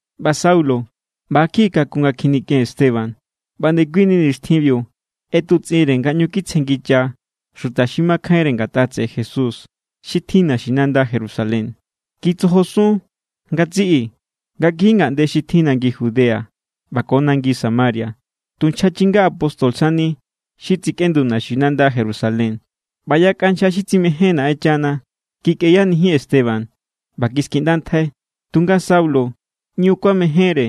ꞌBa Saulo ꞌba= kjiꞌi kakun nga kjinikꞌen Esteban. ꞌBa ndekuini nixtjinbiu ꞌetutsꞌinre nga ꞌñu kitsjengicha xuta xi makjainre ngatꞌa tseꞌe Jesús xi tjin naxinanda Jerusalén. Kitsojosun ngatsiꞌi nga kiji ngaꞌnde xi tjin nangi Judea ꞌba ko nangi Samaria. Tu nchja chinga apóstol sani xi tsekꞌendu naxinanda Jerusalén. ꞌBa yakꞌa nchja xi tsimején Naꞌenchana kikꞌeyanijin Esteban ꞌba kiskiꞌndantjai. Tunga Saulo ꞌñu kuamejénre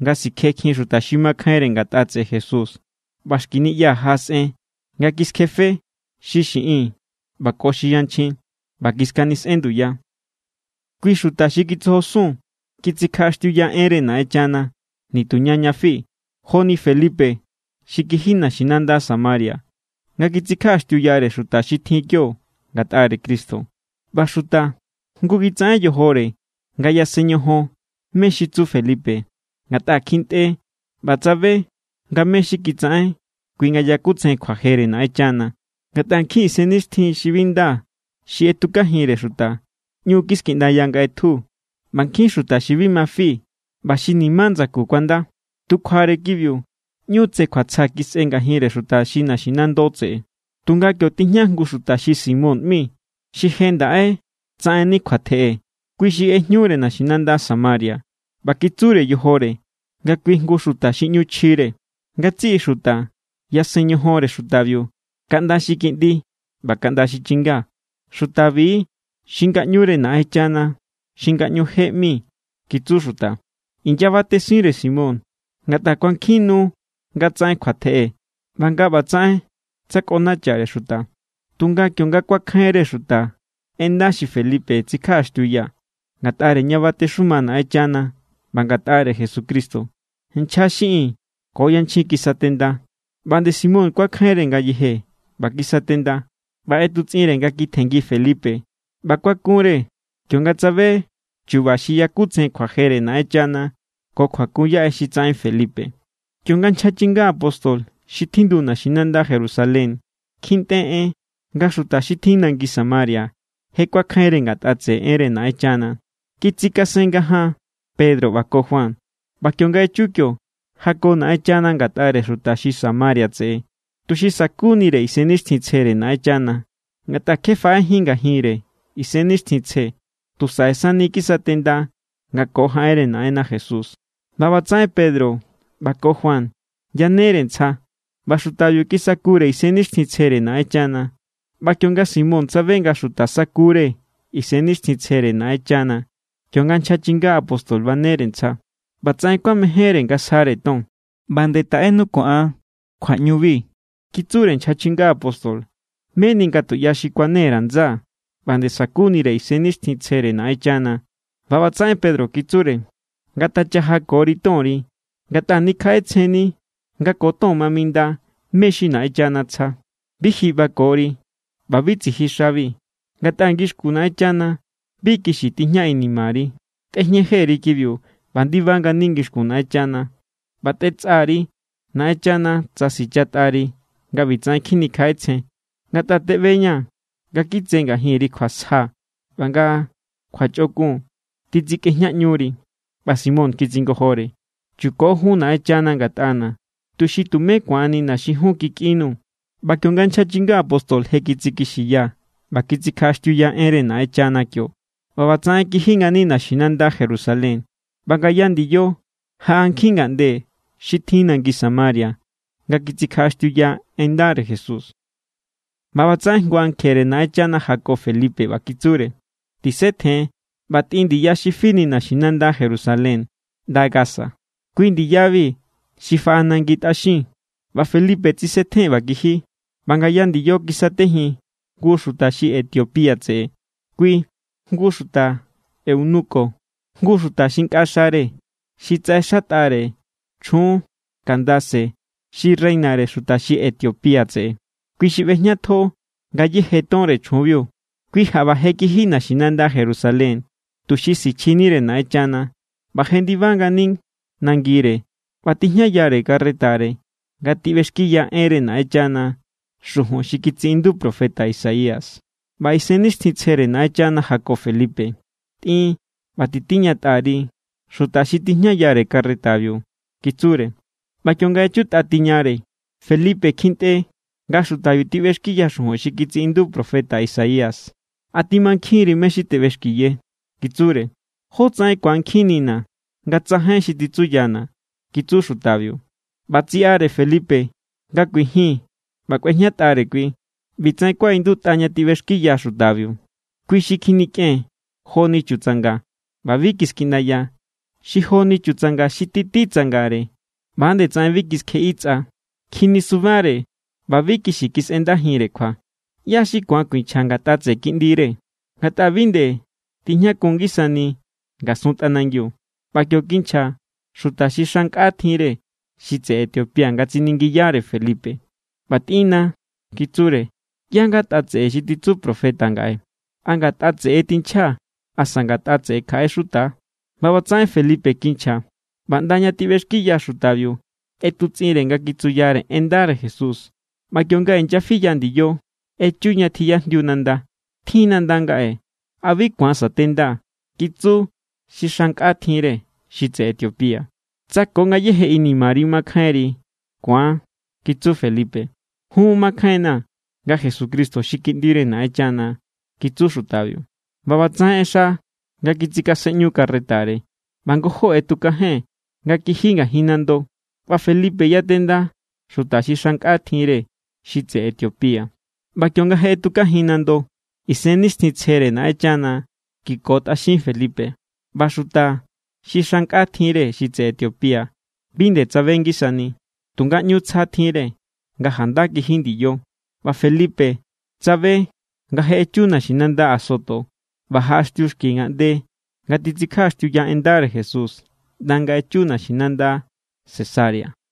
nga sikjekjin xuta xi makjainre ngatꞌa tseꞌe Jesús ꞌba xki niꞌya jaꞌasꞌen nga kiskjefe xi xiꞌin ꞌba ko xi yanchjin ꞌba kiskanisꞌen nduya. Kui xuta xi kitsojosun kitsikjaꞌaxtiuya enre Naꞌenchana nituña ña fi. Joni Felipe xi kiji naxinanda Samaria nga kitsikjaꞌaxtiuyare xuta xi tjin kio ngatꞌare Cristo. ꞌBa xuta jngu kitsaꞌen yojore nga yasen ñojon mé= xi tsu Felipe, ngatꞌa kjintꞌe ꞌba tsabe nga mé= xi kitsaꞌen kui nga yakutsejen kjuajere Naꞌenchana. Ngatꞌa nkjin isennixtjin xi bi nda xi ꞌetjukajinre xuta ꞌñu kiskiꞌndaya nga ꞌetju, ꞌba nkjin xuta xi bi ma fi ꞌba xi ni̱má ndsaku kuanda. Tu kjuare kibiu, ꞌñu tse kjuatsja kisꞌe ngajinre xuta xi naxinando tseꞌe. Tunga kio tijña jngu xuta xi Simón ꞌmi, xi je ndaꞌe tsaꞌenni kjuatjeꞌe. Kui xi ꞌejñure naxinanda Samaria ꞌba kitsure yojore nga kui jngu xuta xi ꞌñu chjire. Ngatsiꞌi xuta yasen ñojonre xutabiu kaꞌnda xi kiꞌndi ꞌba kaꞌnda xi chinga. —Xutabi= xi ngaꞌñure Naꞌenchana xi Ngaꞌñu je ꞌmi —kitsu xuta. Inyabatesinre Simón ngatꞌa kuankjin nu nga tsaꞌen kjuatjeꞌe ꞌba nga ꞌbatsaꞌen tsakꞌonachare xuta. Tunga kionga kuakjainre xuta en nda xi Felipe tsikjaꞌaxtiuya ngatꞌare ña batexuma Naꞌenchana ꞌba ngatꞌare Jesucristo, nchja xiꞌin ko yanchjin kisatenda. ꞌBa nde Simón kuakjainre ngayeje ꞌba kisatenda. ꞌBa ꞌetutsꞌinre nga kitjenngi Felipe ꞌba kuakunre kionga tsabe chu̱ba̱ xi yakutsejen kjuajere Naꞌenchana ko kjuakun yaꞌe xi tsaꞌen Felipe. Kionga nchja chinga apóstol xi tjindu naxinanda Jerusalén kjintꞌe en nga xuta xi tjin nangi Samaria je kuakjainre ngatꞌa tseꞌe enre Naꞌenchana, kitsikasen ngajaan Pedro ꞌba ko Juan. ꞌBa kionga echu kio, jako Naꞌenchana ngatꞌare xuta xi Samaria tseꞌe tuxi sa̱kunire Isennixtjintsjere Naꞌenchana. Ngatꞌa kje faꞌejín ngajinre Isennixtjintsje. Tu saꞌe sani kisatenda nga ko jaꞌenre Naꞌenna Jesús. ꞌBa ꞌbatsaꞌen Pedro ꞌba ko Juan yanere ntsja, ꞌba xutabiu kisakure Isennixtjintsjere Naꞌenchana. ꞌBa kionga Simón tsabe nga xuta sakure Isennixtjintsjere Naꞌenchana kionga nchja chinga apóstol banere ntsja, ꞌbatsaꞌen kuamejénre nga sjare ton. —ꞌBa nde taꞌenu ko an kjuaꞌñubi —kitsure nchja chinga apóstol—, meni nga tuꞌya xi kuane_ra̱ ndsaa̱ ꞌba nde sa̱kunire Isennixtjintsjere Naꞌenchana. ꞌBa ꞌbatsaꞌen Pedro kitsure: —Ngatachajakori tonri ngatꞌa nikjaꞌetsjenni nga ko ton ma minda mé= xi Naꞌenchana tsja. Bi ji ꞌbakori ꞌba bi tsiji xabi, ngatꞌa ngixkun Naꞌenchana bi kixi tijña inimari. Tꞌejñe jeri kibiu ꞌba ndiba ngani ngixkun Naꞌenchana, ꞌba tetsꞌa_ri Naꞌenchana tsa sichatꞌari nga ꞌbitsaꞌen kjinikjaꞌetsjen. Ngatꞌa teꞌbeña̱ nga kitse ngajinri kjuasja ꞌba nga kjuachꞌokun titsikꞌejñaꞌñuri. ꞌBa Simón kitsingojore: —Chuko jun Naꞌenchana ngatꞌana̱, tuxi tumé ku̱annina̱ xi jun kikꞌinnuu̱. ꞌBa kionga nchja chinga apóstol je kitsikixiya ꞌba kitsikjaꞌaxtiuya enre Naꞌenchana kio, ꞌbatsaꞌen kiji ngani naxinanda Jerusalén. ꞌBa ngaya ndiyo, jaꞌa nkjin ngaꞌnde xi tjin nangi Samaria nga kitsikjaꞌaxtiuya en ndare Jesús. ꞌBa ꞌbatsaꞌen jngu ankjere Naꞌenchana jako Felipe ꞌba kitsure: —Tisetjen ꞌba tꞌin ndiya xi fini naxinanda Jerusalén ꞌnda Gaza. Kui ndiyabi xi faꞌa nangi tꞌaxin. ꞌBa Felipe tsisetjen ꞌba kiji, ꞌba ngaya ndiyo kiskajin jngu xuta xi Etiopía tseꞌe. Kui jngu xuta eunuko, jngu xuta xi nkꞌa xare xi tsaꞌexatꞌare chjun Candace xi reinare xuta xi Etiopía tseꞌe. Kui xi ꞌbejñatjo ngayéje tonre chjunbiu. Kui jaꞌba je kiji naxinanda Jerusalén tuxi sichjinire Naꞌenchana ꞌba jendiba ngani nangire. ꞌBa tijñayare carretare nga tiꞌbexkiya enre Naꞌenchana xujun xi kitsiꞌindu profeta Isaías. ꞌBa Isennixtjintsjere Naꞌenchana jako Felipe: —Tꞌin ꞌba titiñatꞌa_ri xuta xi tijñayare carretabiu —kitsure. ꞌBa kionga echutꞌa tiñare, Felipe kjintꞌe nga xutabiu tiꞌbexkiya xujun xi kitsiꞌindu profeta Isaías. —¿A timankjin=ri mé= xi teꞌbexkiye? —kitsure. —¿Jótsaꞌen ku̱ankjinnina̱ nga tsajain xi titsuyana̱? —kitsu xutabiu. ꞌBa tsiꞌare Felipe nga kuijin ꞌba kꞌuejñatꞌare kui. ꞌBi tsaꞌen kuaꞌindutꞌa ña tiꞌbexkiya xutabiu: Kui xi kjinikꞌen joni chutsanga, ꞌba bi kiskiꞌndaya. Xi joni chutsanga xi títi tsangare, ꞌba nde tsaꞌen bi kiskjeꞌi tsꞌa. Kjinisubare ꞌba bi kixi kisꞌendajinre kjua. ¿ꞌYá= xi ku̱an kuinchja ngatꞌa tseꞌe kiꞌndire? Ngatꞌa bi nde tijñakun ngisani ngasun tꞌanangiu. ꞌBa kio kinchja xuta xi xa nkꞌa tjinre xi tseꞌe Etiopía nga tsiningiyare Felipe: —ꞌBa tꞌinna̱ —kitsure—, ¿ꞌyá= ngatꞌa tseꞌe xi titsu profeta ngaꞌe? ¿A ngatꞌa tseꞌe= tinchja asa ngatꞌa tseꞌe kjaꞌe xuta? ꞌBa ꞌbatsaꞌen Felipe kinchja ꞌba ꞌnda ña tiꞌbexkiya xutabiu ꞌetutsꞌinnire nga kitsuyare en ndare Jesús. ꞌBa kionga inyafiya ndiyo, echu ña tjiyajndiu nanda. —Tjin nanda ngaꞌe. ¿A bi ku̱an sa̱tendaa̱? —kitsu xi xa nkꞌa tjinre xi tseꞌe Etiopía. —Tsa ko ngayéje inimari makjainri, ku̱an —kitsu Felipe. —Jun, makjainna̱ nga Jesucristo xi Kiꞌndire Naꞌenchana —kitsu xutabiu. ꞌBa ꞌbatsaꞌen ꞌexa nga kitsikasenꞌñu carretare, ꞌba ngojó ꞌetukajen nga kiji ngajin nando, ꞌba Felipe yatenda xuta xi xa nkꞌa tjinre xi tseꞌe Etiopía. ꞌBa kionga je ꞌetukajin nando, Isennixtjintsjere Naꞌenchana kiko tꞌaxin Felipe. ꞌBa xuta xi xa nkꞌa tjinre xi tseꞌe Etiopía bi nde tsabe ngisani, tunga ꞌñu tsja tjinre nga janda kiji ndiyo. ꞌBa Felipe tsabe nga je echu naxinanda Azoto ꞌba jaꞌaxtiu xki ngaꞌnde nga titsikjaꞌaxtiuya en ndare Jesús ꞌnda nga echu naxinanda Cesarea.